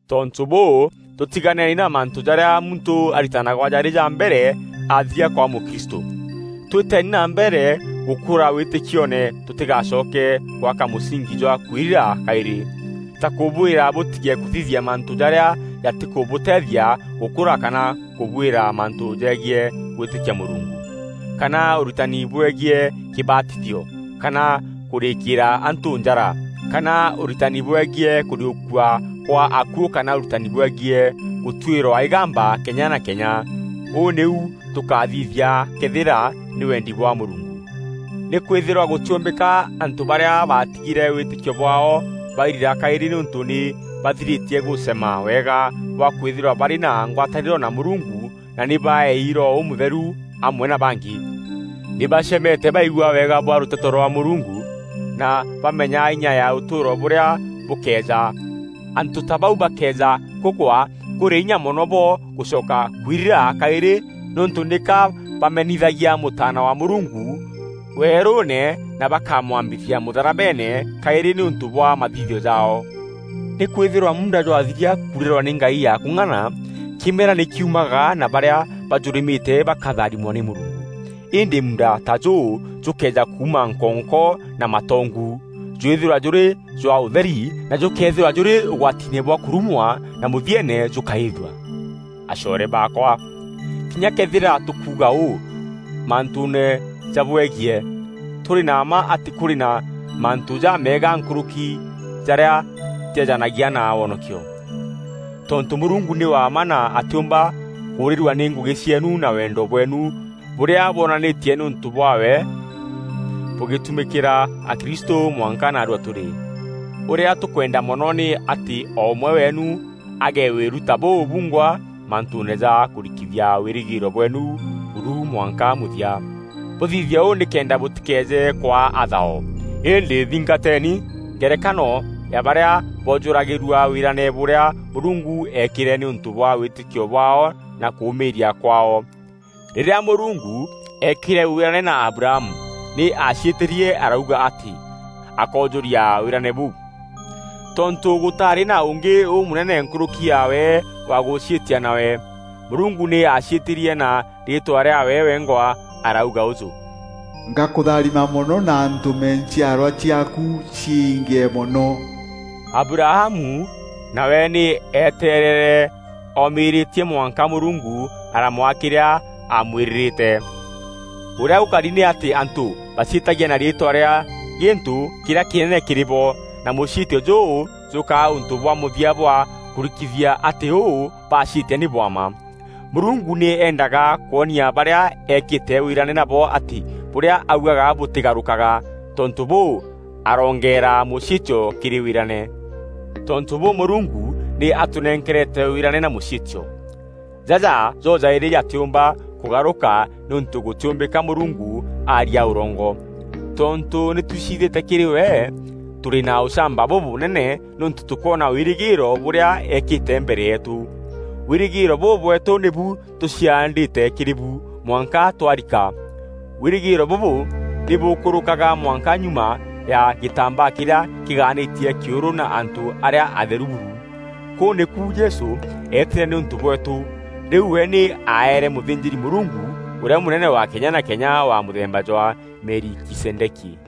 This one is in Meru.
Tontû bûû, tûtiganeeni na mantû jarîa muntû aritanagwa jarî ja mbere athîria kwaa mûkristû. Twîteni na mbere gûkûra wîtîkioone tûtîgacoke gwaka mûsingi jwa kwirira kaîrî: ta kûbwîra bûtige kûthithia mantû jarîa jatîkûbûteethia gûkûra kana kûbwîra mantû jegiî gwîtîkia Mûrungu; kana ûritani bwegiî kîbatithio, kana kûrîîkîra antû njara, kana ûritani bwegiî kûriûkua gwa akuû kana ûritani bwegiî gûtuîrwa îgamba kenya na kenya. Ûu nîu tûkathithia këethîra nî wendi bwa Mûrungu. Nîkwîthîrwa gûtîûmbîka antû barîa baatigîre wîtîkio bwaao bairira kaîrî nîûntû nî bathirîtie gûcema wega bwa kwîthîrwa barî na ngwatanîro na Mûrungu na nî baeei Roho Ûmûtheru amwe na bangî. Nî bacemete baigua wega bwa rûteto rwa Mûrungu, na baamenya inya ya ûtûûro bûrîa bûkeeja. Antû ta bau bakëeja kûgwa, kûrî inya mono bo gûcoka kwirira kaîrî nîûntû nîka bamenithagia Mûtaana wa Mûrungu weerûûne na bakamwambithia mûtharabeene kaîrî nîûntû bwa mathithio jaao. Nîkwîthîrwa muunda jwathiria kuurîrwa nî ngai ya kûng'ana, kîmera nî kiumaga na barîa bajûrîmîte bakatharimwa nî Mûrungu. Îndî muunda ta jûu jûkëeja kuuma nkonko na matongu, jwîthîrwa jûrî jwa ûtheri na jûkeethîrwa jûrî ûgwatiine bwa kûrumwa na mûthieene jûkaîîthua. Acoore baakwa, kînya këethîra tûkuuga ûu mantûûne jabwegiî, tûrî na mma atî kûrî na mantû jameega nkûrûki jarîa jeejanagia na wonokio. Tontû Mûrungu nî wa mma na atîûmba kûûrîrua nî ngûgî cieenu na wendo bweenu bûrîa bwonanîtie nîûntû bwaawe bûgîtumîkîra akristû mwanka naarua tûrî. Ûrîa tûkwenda mono nî atî o ûmwe weenu agîe wîru ta bûu bungwa, mantûûne ja kûrikithia wîrîgîîro bweenu buru mwanka mûthia. Bûthithie ûu nîkenda bûtîkeeje kwaa athao. Îndî thingateni ngerekano ya barîa boojûragîrua wîrane bûrîa Mûrungu eekîre nîûntû bwa wîtîkio bwaao na kûûmîîria kwaao. Rîrîa Mûrungu eekîre wîrane na Abrahamu nî aaciîtîrie arauga atî akoojûria wîrane bûu. Tontû gûtaarî na ûngî ûmûnene nkûrûki yaawe wa gûciîtia nawe, Mûrungu nî aaciîtîrie na riîtwa rîaawe wengwa. Arauga ûjû, “Ngakûtharima mono na ntûme nchiarwa ciaaku ciingîe mono.” Abrahamu nawe nî eeteerere omîîrîtie, mwanka Mûrungu aramwaa kîrîa aamwîrîrîte. Ûrîa gûkari nî atî antû baciîtagia na riîtwa rîa gîntû kîrîa kînene kîrî bo, na mûciîtio jûu jûkaa ûntû bwa mûthia bwa kûrikithia atî ûu baciîtia nî bwa mma. Mûrungu nî eendaga kwonia barîa eekîte wîrane nabo atî bûrîa augaga bûtîgarûkaga. Tontû bûu, aroongeera mûciîtio kîrî wîrane. Tontû bûû, Mûrungu nî aatûnenkerete wîrane na mûciîtio. Jaja jo-jaîrî jatîûmba kûgarûka nîûntû gûtîûmbîka Mûrungu aaria ûrongo. Tontû nî twiciithîte kîrî we, tûrî na ûchamba bûbûnene nîûntû tûkoona wîrîgîîro bûrîa eekîte mbere yeetû. Wîrîgîîro bûu bweetû nîbu tûciandîte kîrî bu mwanka twarika. Wîrîgîîro bûbû nî bûkûrûkaga mwanka nyuma ya gîtaambaa kîrîa kîgaanîtie kîûrû na antû arîa atheru buru. Kûu nîku Jesû eetîre nîûntû bweetû. Rîu we nî aaere mûthînjîri-Mûrungu ûrîa mûnene wa kenya na kenya wa mûthemba jwa Melikizedeki.